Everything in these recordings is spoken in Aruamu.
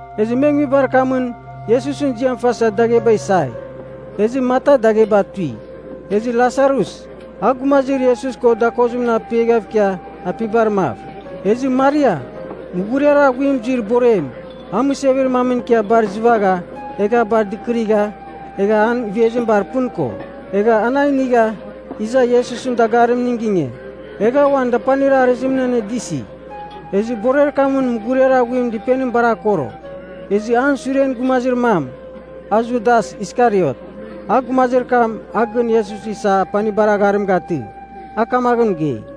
Ezɨ me nguibar kamɨn Iesusɨn ziam fasa dagheba isai. Ezɨ Marta dagheba tui. Ezɨ Lasarus, a gumazir Iesus ko dakozimɨn apiaghav ikia apibar mav. Ezɨ Maria, mughuriar aghuim zuir borem, a mɨsevir mamɨn ikia bar izɨvagha, egha a bar dɨkɨrigha egha an ivezim bar pɨn ko. Egha an a inigha iza Iesusɨn dagarimning ginge, egha uan dapanir arɨzimɨn anedɨsi. Ezɨ borer kamɨn mughuriar aghuim dɨpenim bar akoro. Ezɨ an suren gumazir mam, a Judas Iskariot, a gumazir kam a gɨn Iesus isa apanibar agharim gatɨ, a kamaghɨn mɨgei,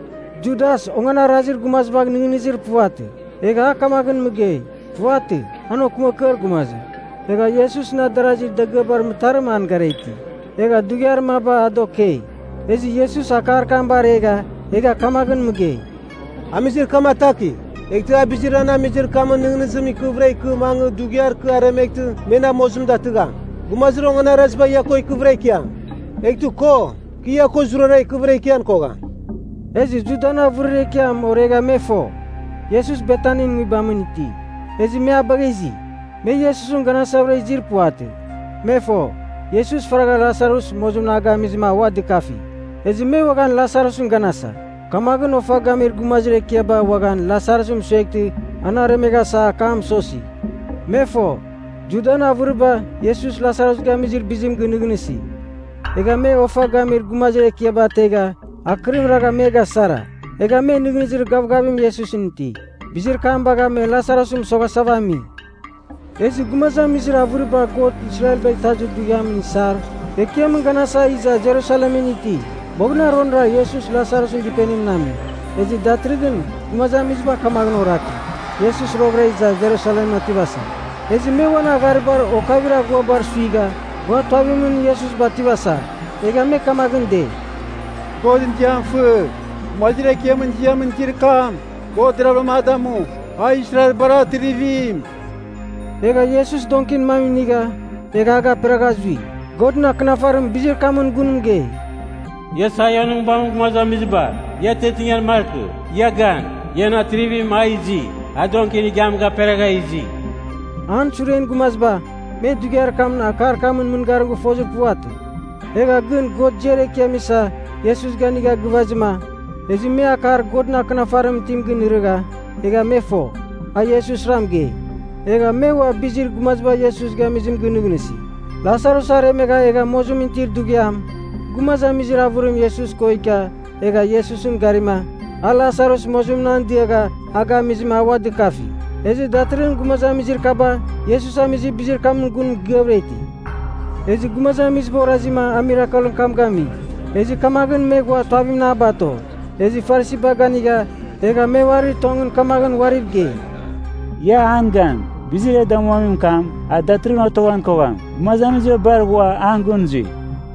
Judas onganarazir gumazibagh nɨghnɨzir puvatɨ, egha a kamaghɨn mɨgei. Puvatɨ. An okɨmakɨar gumazim. Egha Iesusɨn adarazir dagɨabar mɨtarim an gara iti, egha dughiar maba a da okei. Ezɨ Iesus akar kam baregha egha kamaghɨn mɨgei, “Amizir kam atakigh! Eghtɨ a bizir an amizir kamɨn nɨghnɨzim ikɨvɨra ikɨ mangɨ dughiar kɨ aremeghtɨ me na mozim datɨgham. Gumazir onganaraziba ia ko ikɨvɨra ikiam. Eghtɨ ko, kɨ ia ko zurara ikɨvɨra ikian kogham.” Ezɨ Judan avɨrir ekiam oregha me fo, Iesus Betanin nguibamɨn iti. Ezɨ me a bagha izi. Me Iesusɨn ganasavɨra izir puvatɨ. Me fo, Iesus faragha Lasarus mozimɨn a gamizɨma a ua dɨkafi. Ezɨ me uaghan Lasarusɨn ganasa. Kamaghɨn ofa gamir gumazir ekiaba uaghan Lasarus mɨsueghtɨ an aremeghasa akam mɨsosi. Me fo, Judan avɨriba Iesus Lasarus gamizir bizim ginɨghnɨsi, egha me ofa gamir gumazir ekiaba ategha akɨrim ragha me gasara, egha me nɨghnɨzir gavgavim Iesusɨn iti. Bizir kam bagha me Lasarus mɨsoghasava ami. Ezɨ gumazamizir avɨriba God Israelbagh Itazir Dughiamɨn isar ekiamɨn ganasa iza Jerusalemɨn iti. Boghɨnaronra Iesus Lasarusɨn dɨpenimɨn ame. Ezɨ datɨrɨghɨn gumazamiziba kamaghɨn oraki, Iesus roghɨra iza Jerusalemɨn otivasa. Ezɨ me uan agharibar okavir aghuabar suigha ghua tuavimɨn Iesus bativasa, egha me kamaghɨn dei, “Godɨn ziam fɨ! Gumazir Ekiamɨn ziamɨn izir kam, God deravɨra a damu. A Israelbar Atrivim!” Egha Iesus donkin mam inigha egha a gaperagha zui. Godɨn Akɨnafarim bizir kamɨn gun mɨgei, “Ia Saionɨn nguibamɨn gumazamiziba, ia atiatingan markɨ. Ia gan. Ian Atrivim a izi. A donkin igiam gaperagha izi.” An suren gumaziba, me dughiar kam akar kamɨn mɨngarim gɨfozir puvatɨ. Egha gɨn God ziar ekiam isa Iesus ganigha gɨvazɨma, ezɨ me akar Godɨn Akɨnafarimɨn itim ginɨrɨgha egha me fo, a Iesusra mɨgei. Egha me ua bizir gumaziba Iesus gamizim gɨnɨghnɨsi. Lasarus aremegha egha mozimɨn itir dughiam, gumazamizir avɨrim Iesus ko ikia egha Iesusɨn garima, a Lasarus mozimɨn an diagha a gamizɨma a ua dɨkafi. Ezɨ datɨrɨghɨn gumazamizir kaba, Iesus amizir bizir kamɨn gun mɨgɨavɨra iti. Ezɨ gumazamiziba orazima a mirakelɨn kam gami, ezɨ kamaghɨn me ghua tuavimɨn a bato. Ezɨ Farisiba ganigha, egha me uarir tongɨn kamaghɨn uariv gei, “Ia an gan! Bizir e damuamin kam, a datɨrɨghɨn otoghan kogham. Gumazamiziba bar ghua an gɨn zui.”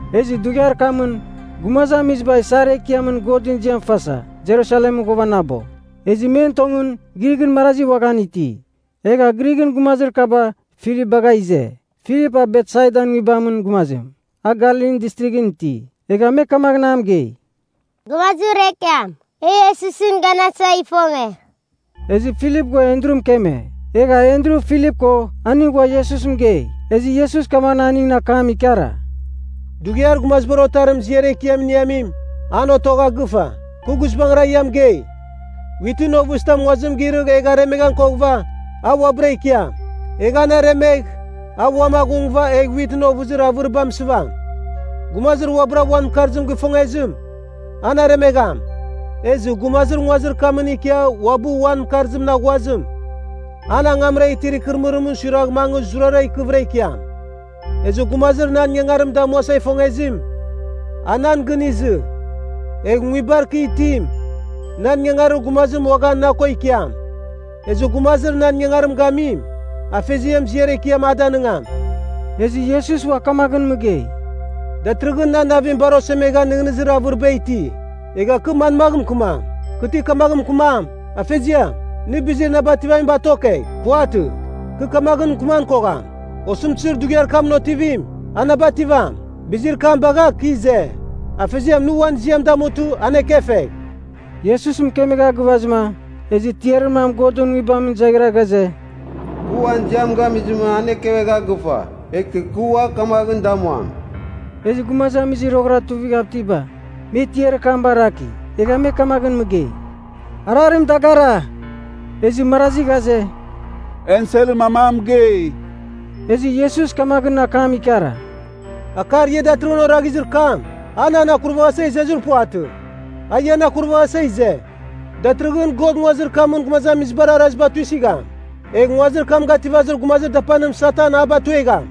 Ezɨ dughiar kamɨn, gumazamiziba isar ekiamɨn Godɨn ziam fasa Jerusalemɨn ghuavanabo, ezɨ men tongɨn, Grighɨn marazi uaghan iti. Egha Grighɨn gumazir kaba Filip bagha ize. (Filip a Betsaidan nguibamɨn gumazim, a Galilin Distrighɨn iti.) Egha me kamaghɨn a mɨgei, “Gumazir ekiam, e Iesusɨn ganasa ifonge.” Ezɨ Filip ghua Andru mɨkeme. Egha Andru, Filip ko aning ghua Iesus mɨgei. Ezɨ Iesus kamaghɨn aningɨn akam ikara, “Dughiar Gumaziba Otarim ziar ekiam iniamim, an otogha gɨfa. Kɨ guizbangɨra ia mɨgei, witɨn ovɨzitam nguazim girɨgh egh aremeghan koghɨva, a uabɨra ikiam. Egh an aremegh, a uam aghungɨva egh witɨn ovɨzir avɨriba mɨsɨvam. Gumazir uabɨra uan mɨkarzim gifongezim, an aremegham. Ezɨ gumazir nguazir kamɨn ikia uabɨ uan mɨkarzim aghuazim, an angamra itir ikɨrɨmɨrimɨn suiragh mangɨ zurara ikɨvɨra ikiam. Ezɨ gumazir nan ingangarim damuasa ifongezim, a nan gɨn izɨ. Egh nguibar kɨ itim, nan ingangarir gumazim uaghan na ko ikiam. Ezɨ gumazir nan ingangarim gamim, Afeziam ziar ekiam a danɨngam.” Ezɨ Iesus ua kamaghɨn mɨgei, “Datɨrɨghɨn nan navim bar osemegha nɨghnɨzir avɨriba iti. Egha kɨ manmagh mɨkɨmam? Kɨ ti kamagh mɨkɨmam, ‘Afeziam, nɨ bizir na bativamim batokegh?’ Puvatɨ. Kɨ kamaghɨn mɨkɨman kogham. Osɨmtɨzir dughiar kamɨn otivim, a na bativam. Bizir kam bagha kɨ ize. Afeziam nɨ uan ziam damutɨ, an ekefegh!” Iesus mɨkemegha gɨvazɨma, ezɨ tiarir mam Godɨn Nguibamɨn zaghira ghaze, “Kɨ uan ziam gamizɨma an ekevegha gɨfa, eghtɨ kɨ ua kamaghɨn damuam.” Ezɨ gumazamizir roghɨra tughav itiba, me tiarir kam baraki, egha me kamaghɨn mɨgei, “Ararim dagara!” Ezɨ marazi ghaze, “Enselɨn mam a mɨgei!” Ezɨ Iesus kamaghɨn akam ikara, “Akar ia datɨrɨghɨn oraghazir kam, a nan akurvaghasa izezir puvatɨ. A ian akurvaghasa ize. Datɨrɨghɨn God nguazir kamɨn gumazamizibar araziba tuisɨgham. Egh nguazir kam gativazir gumazir dapanim Satan a batuegham.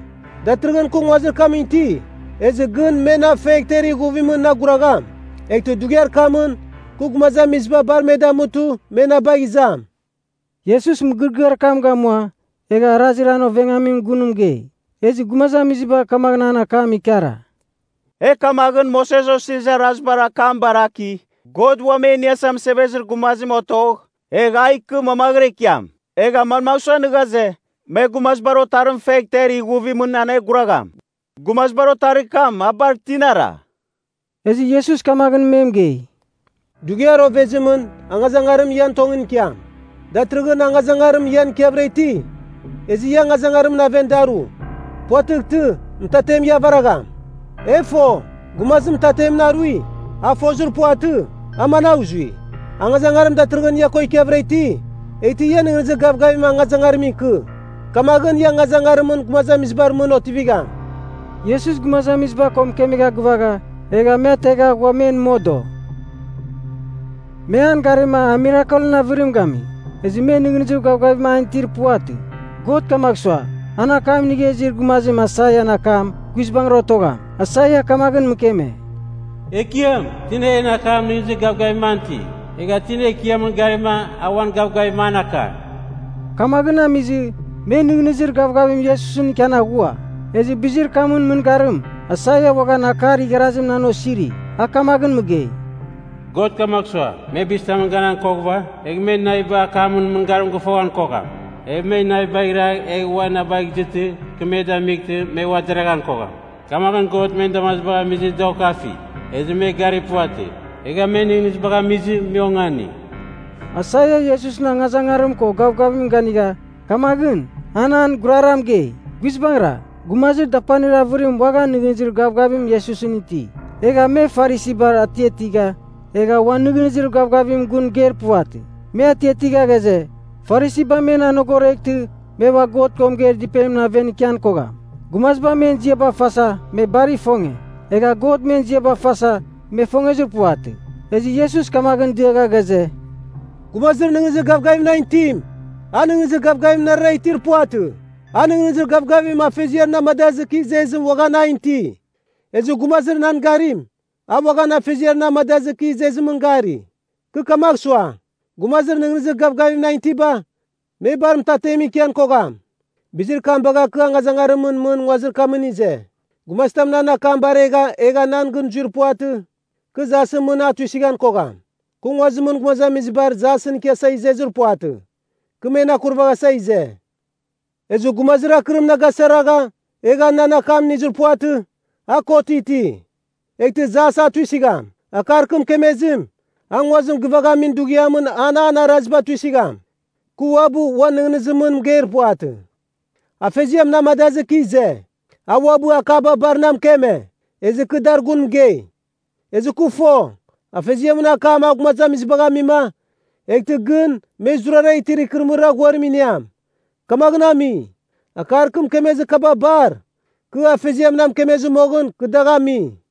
Datɨrɨghɨn kɨ nguazimɨn iti, ezɨ gɨn me na fegh ter ighuvimɨn na aguragham, eghtɨ dughiar kamɨn kɨ gumazamiziba bar me damutɨ me na bagh izam.” (Iesus mɨgɨrɨgɨar kam gamua egha arazir an ovengamimɨn gun mɨgei.) Ezɨ gumazamiziba kamaghɨn an akam ikara, “E kamaghɨn Moses Osirizir Arazibar akam baraki, God Uam E Iniasa Mɨsevezir Gumazim otogh, egh a ikɨ mamaghɨra ikiam. Egha manmagh sua nɨ ghaze, ‘Me Gumazibar Otarim fegh ter ighuvimɨn aneguragham?’ Gumazibar Otarir kam, a bar tinara?” Ezɨ Iesus kamaghɨn me mɨgei, “Dughiar ovezimɨn angazangarim ian tongɨn ikiam. Datɨrɨghɨn angazangarim ian ikiavɨra iti, ezɨ ia angazangarimɨn aven daru. Puvatɨghtɨ, mɨtatem ia avaragham. E fo, gumazim mɨtatemɨn arui, a fozir puvatɨ, a managh zui. Angazangarim datɨrɨghɨn ia ko ikiavɨra iti, eghtɨ ia nɨghnɨzir gavgavim angazangarimɨn ikɨ. Kamaghɨn ia angazangarimɨn gumazamizibar mɨn otivigham.” Iesus gumazamiziba ko mɨkemegha gɨvagha, egha me ategha ghua men modo. Me an garima a mirakelɨn avɨrim gami. Ezɨ me nɨghnɨzir gavgavim an itir puvatɨ. God kamagh sua, an akam inigha izir gumazim Aisaian akam guizbangɨra otogham. Aisaia kamaghɨn mɨkeme, “Ekiam, tina en akam nɨghnɨzir gavgavim an iti? Egha tina Ekiamɨn garima, a uan gavgavim an aka?” Kamaghɨn amizɨ me nɨghnɨzir gavgavim Iesusɨn ikian aghua. Ezɨ bizir kamɨn mɨngarim, Aisaia uaghan akar igharazim an osiri. A kamaghɨn mɨgei, “God kamagh sua, me bizitamɨn ganan koghɨva, egh me naviba akamɨn mɨngarim gɨfoghan kogham. Egh me navibagh iragh egh ua na bagh izɨtɨ, kɨ me damightɨ me ua deraghan kogham. Kamaghɨn God men damazibagh amizɨ da okafi, ezɨ me gari puvatɨ. Egha men nɨghnɨzibagh amizɨ me ongani.” Aisaia Iesusɨn angazangarim ko gavgavimɨn ganigha, kamaghɨn an an gurara mɨgei. Guizbangɨra, gumazir dapanir avɨrim uaghan nɨghnɨzir gavgavim Iesusɨn iti. Egha me Farisibar atiatigha, egha uan nɨghnɨzir gavgavimɨn gun mɨgeir puvatɨ. Me atiatigha ghaze, Farisiba men anogoreghtɨ me ua God ko mɨgeir dɨpenimɨn aven ikian kogham. Gumaziba men ziaba fasa me bar ifonge, egha God men ziaba fasa me ifongezir puvatɨ. Ezɨ Iesus kamaghɨn diagha ghaze, “Gumazir nɨghnɨzir gavgavim nan itim, a nɨghnɨzir gavgavim narara itir puvatɨ. A nɨghnɨzir gavgavim Afeziar na amadazɨ kɨ izezim uaghan an iti. Ezɨ gumazir nan garim, a uaghan Afeziar na amadazɨ kɨ izezimɨn gari. Kɨ kamagh sua, gumazir nɨghnɨzir gavgavim nan itiba, me bar mɨtatemɨn ikian kogham. Bizir kam bagha kɨ angazangarimɨn mɨn nguazir kamɨn ize. “Gumazitam nan akam baregha egha nan gɨn zuir puvatɨ, kɨ jasɨn mɨn a tuisɨghan kogham. Kɨ nguazimɨn gumazamizibar jasɨn ikiasa izezir puvatɨ. Kɨ men akurvaghasa ize. Ezɨ gumazim akɨrim na gasara egha nan akam inizir puvatɨ, a kot iti, eghtɨ jas a tuisɨgham. Akar kɨ mɨkemezim, a nguazim gɨvaghamin dughiamɨn an an araziba tuisɨgham. Kɨ uabɨ uan nɨghnɨzimɨn mɨgeir puvatɨ. Afeziam na amadazɨ kɨ ize. A uabɨ akaba bar na mɨkeme, ezɨ kɨ dar gun mɨgei. Ezɨ kɨ fo, Afeziamɨn akam a gumazamizibagh amima, eghtɨ gɨn me zurara itir ikɨrɨmɨrir aghuarim iniam. Kamaghɨn ami, akar kɨ mɨkemezir kaba bar, kɨ Afeziam na mɨkemezɨ moghɨn kɨ dagh ami.”